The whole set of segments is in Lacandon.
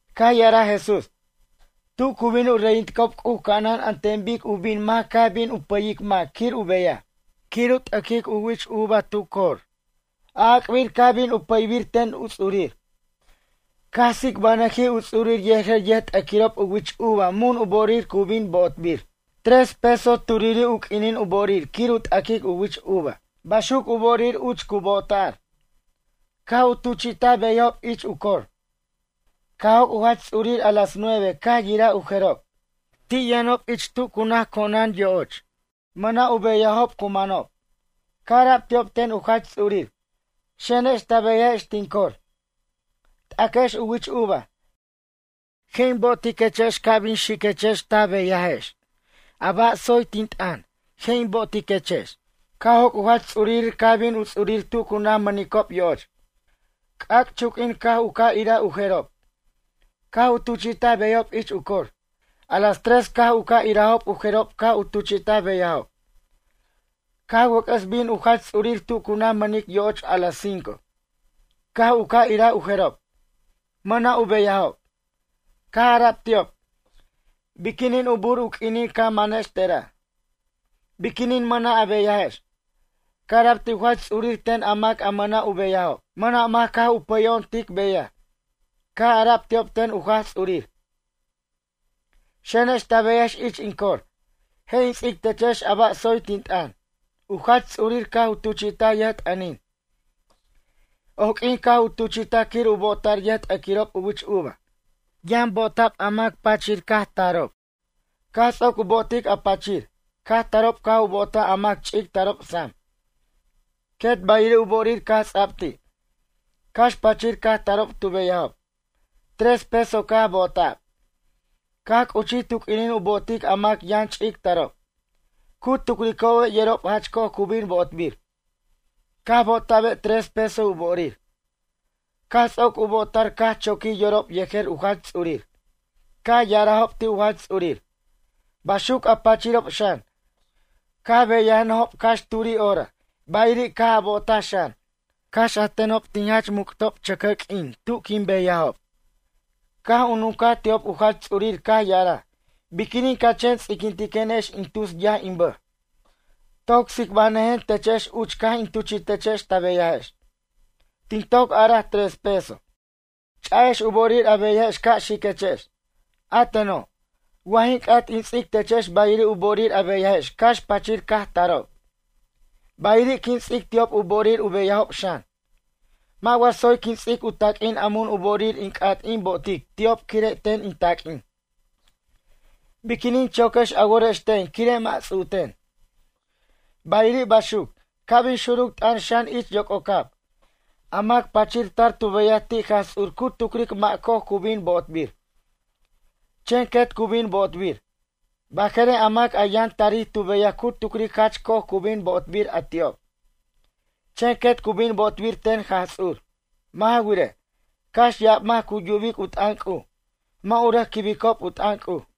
Caj ya'araj Jesús: ―Tu cu bin u reyinticob C'uj ca'anan an ten bic u bin mac caj bin u pʌyic mac quir u beyaj, quir u t'aquic u wich uva tu cor. A'ac'bir caj bin u pʌybir ten u ts'urir. Caj tsicbajnʌjij u ts'urir yejer yʌjt'aquirob u wich uva mun u bo'orir cu bin bo'otbir. Tres pesos turi' u q'uinin u bo'orir quir u t'aquic u wich uva. Baxuc u bo'orir uch cu bo'ota'r. Caj u tuchi'taj beyajob ich u cor. Caj joc' u jach ts'urir a las nueve caj yiraj u jerob. Ti' yʌnob ich tu naj co'onan yo'och. Mʌna' u beyajob cu manob. Caj ara'b ti'ob ten u jach ts'urir: “Xenex ta beyajex tin cor. T'aquex u wich uva. Je' in bo'otiquex ca' bin xiquechex ta beyajex. A ba' tsoy tin t'ʌn je' in bo'otiquex.” Caj joc' u jach ts'urir caj bin u ts'urir tu cu naj mʌnic yo'och. C'ac'chunq'uin ca' u ca' iraj u jerob. Caj u tuchi'taj beyajob ich u cor. A las tres caj u ca' irajob u jerob caj u tuchi'taj beyajob. Caj wʌc'ʌs bin u jach ts'urir tu cu naj mʌnic yo'och a las cinco. Caj u ca' iraj u jerob. Mʌna' u beyajob. Caj ara'b ti'ob: “Biquinin u bur u q'uinin ca manex tera'? Biquinin mʌna' a beyajex?” Caj ara'b ti' u jach ts'urir ten a mac mʌna' u beyajob: “Mʌna' mac caj u pʌyo'on tic beyaj.” Caj ara'b ti'ob ten u jach ts'urir: “Xenex ta beyajex ich in cor. Je' in ts'ic techex a ba' tsoy tin t'ʌn.” U jach ts'urir caj u tuchi'taj yʌjt'ʌnin. Oq'uin caj u tuchi'taj quir u bo'ota'r yʌjt'aquirob u wich uva. Yʌn bo'ota'r a mac pachir caj tarob. Caj ts'oc u bo'otic a pachir, caj tarob caj u bo'otaj a mac ch'ic tarob sam. Quet bayiri' u bo'orir caj ts'a'b ti'. Cax pachir caj tarob tu beyajob. Tres pesos caj bo'ota'b. Caj c'uchij tu q'uinin u bo'otic a mac yʌn ch'ic tarob. Cu tucricobe' yerob jach co'oj cu bin bo'otbir. Caj bo'ota'be' tres pesos u bo'orir. Caj ts'oc u bo'ota'r caj choquij yorob yejer u jach ts'urir. Caj ya'arajob ti' u jach ts'urir: “Baxuc a pachirob xan, caj beyajnʌjob cax turi' hora. Bayiri' caj bo'ota'b xan. Cax a tenob tin jach muc'ob chʌcʌr q'uin tu quin beyajob.” Caj u nuncaj ti'ob u jach ts'urir caj ya'araj: “Biquinin ca chen ts'iquintiquenex in tus yaj in bʌj. Toc tsicbanʌjen techex uch caj in tuchi'techex ta beyajex. Tin toc araj tres pesos. Ch'a'ex u bo'orir a beyajex ca' xiquechex. A teno', wa jin c'at in ts'ic techex bayiri' u bo'orir a beyajex cax pachir caj tarob. Bayiri' quin ts'ic ti'ob u bo'orir u beyajob xan. Mʌ' wa tsoy quin ts'ic in taq'uin a mun u bo'orir in c'at in bo'otic ti'ob quire' ten in taq'uin? Biquinin choquex a worex ten quire' mʌ' ts'u'ten?” Bayiri' baxuc, ca' bin xuruc t'ʌn xan ich yoc'ocab. A mac pachir tar tu beyaj ti' Jaj Ts'ur cu tucric mʌ' co'oj cu bin bo'otbir, chen quet cu bin bo'otbir. Barej a mac a yʌn tarij tu beyaj cu tucric jach co'oj cu bin bo'otbir a ti'ob, chen quet cu bin bo'otbir ten Jaj Ts'ur. Mʌ' ja wirej, cax ya'ab mac cu yubic u t'ʌn C'uj, mʌ' u rʌc quibicob u t'ʌn C'uj.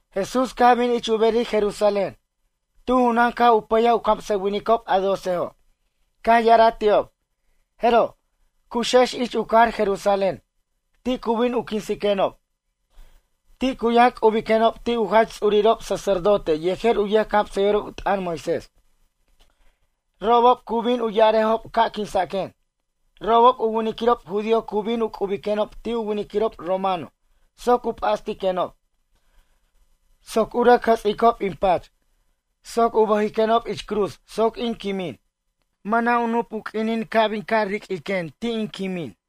Jesús caj bin ich u berir Jerusalén. Tu junan caj u pʌyaj u camsʌwinic a docejo'. Caj ya'araj ti'ob: ―Jeroj, cu'uxex ich u cajar Jerusalén. Ti' cu bin u quinsiquenob. Ti' cu yʌn c'ubiquenob ti' u jach ts'urirob sacerdote yejer u yʌjcamsʌyʌjirob u t'ʌn Moisés. Robob cu bin u ya'arejob ca' quinsaquen. Robob u winiquirob judío cu bin u c'ubiquenob ti' u winiquirob romano soc u p'astiquenob. Soc u rʌc jʌts'icob in pach, soc u bʌjiquenob ich cruz soc in quimin. Mʌna' u nup u q'uinin ca' bin ca' riq'uiquen ti' in quimin.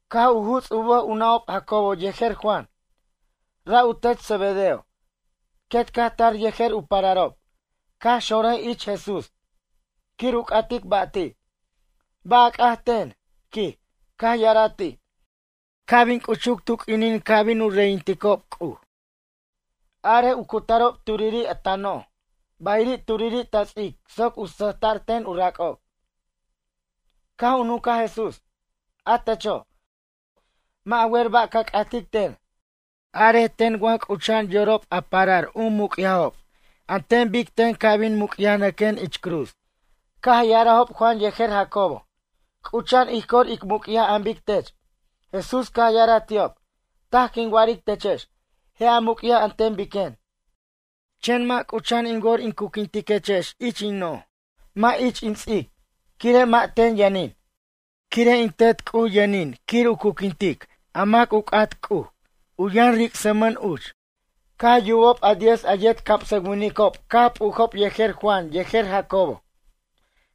Caj u juts' u bʌj u nʌ'ob Jacobo yejer Juan. Ra' u tet Zebedeo. Quet caj tar yejer u pararob. Caj xonrʌj ich Jesús quir u c'atic ba' ti': ―Ba' a c'at ten? ―quij. Caj ya'araj ti': ―Ca' bin c'uchur tu q'uinin ca' bin u reyinticob C'uj. Arej u cutarob turiri' ta noj, bayiri' turiri' ta ts'ic soc u sʌjta'r ten u rac'ob. Caj u nuncaj Jesús: ―A techo', mʌ' a wer ba' ca c'atic ten. Arej ten wa c'ucha'an yorob a parar u muc'yajob an ten bic ten ca' bin muc'yajnʌquen ich cruz. Caj ya'arajob Juan yejer Jacobo: ―C'ucha'an ij cor ic muc'yaj an bic tech. Jesús caj ya'araj ti'ob: ―Taj quin wa'aric techex. Je' a muc'yaj an ten biquen. Chen mʌ' c'ucha'an in wor in curquintechex ich in noj mʌ' ich in ts'ic, quire' mʌ' ten yʌnin. Quire' in Tet C'uj yʌnin quir u curquintic mac u c'at C'uj. U yʌn ricsmʌn uch. Caj yubob a diez a yet camsʌwinicob caj p'ujob yejer Juan yejer Jacobo.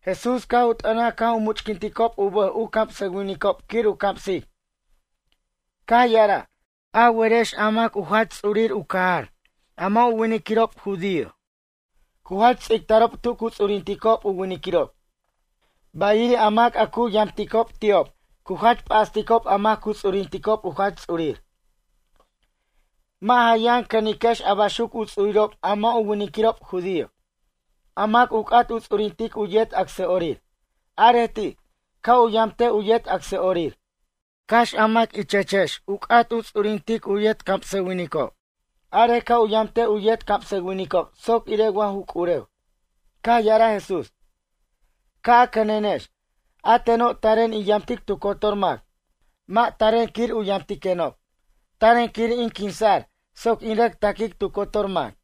Jesús caj u t'ʌnaj caj u much'quinticob u bʌj u camsʌwinicob quir u camsic. Caj ya'araj: ―A werex a mac u jach ts'urir u cajar a mʌ' u winiquirob judío. Cu jach ts'ictarob tu cu ts'urinticob u winiquirob. Bayiri' a mac a cu yamticob ti'ob cu jach p'asticob a mac cu ts'urinticob u jach ts'urir. Mʌ' ja yʌn cʌniquex a baxuc u ts'urirob a mʌ' u winiquirob judío. A mac u c'at u ts'urintic u yet acsa'orir. Arej ti', ca' u yamtej u yet acsa'orir. Cax a mac ichechex u c'at u ts'urintic u yet camsʌwinicob. Arej ca' u yamtej u yet camsʌwinicob soc irej wa ju c'urew. Caj ya'araj Jesús: ―Ca' a cʌnenex. A teno' taren in yamtic tu cotor mac. Mʌ' taren quir u yamtiquenob. Taren quir in quinsa'r soc in rʌc taquic tu cotor mac.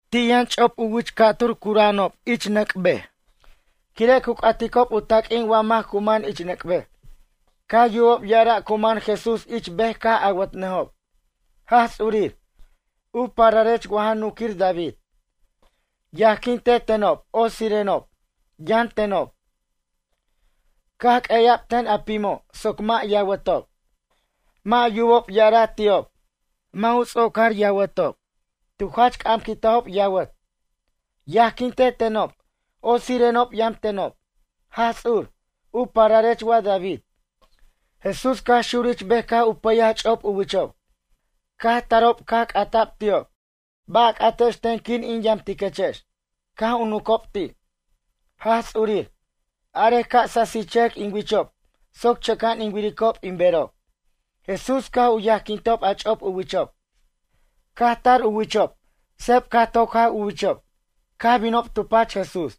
Ti' yʌn ch'op u wich ca'tur cura'anob ich nʌc' bej. Quire' cu c'aticob u taq'uin wa mac cu man ich nʌc' bej. Caj yubob ya'araj cu man Jesús ich bej caj awʌtnʌjob: ―Jaj Ts'urir, u pararech wa ja nunquir David. Yajquinte tenob otsirenob, yam tenob. Caj q'ueya'b ten a pim soc mʌ' yawʌtob. Mʌ' yubob ya'araj ti'ob. Mʌ' ts'ocar yawʌtob. Tu jach c'amquintajob yawʌt: ―Yajquinte tenob, otsirenob yam tenob, Jaj Ts'ur, u pararech wa David. Jesús caj xurij ich bej caj u pʌyaj ch'op u wichob. Caj tarob caj c'ata'b ti'ob: ―Ba' a c'atex ten quir in yamtiquechex? Caj u nuncob ti': ―Jaj Ts'urir, arej ca' sasichʌjʌc in wichob soc chʌca'an in wiricob in berob. Jesús caj u yajquintob a ch'op u wichob. Caj tar u wichob. Sep caj toc jaw u wichob. Caj binob tu pach Jesús.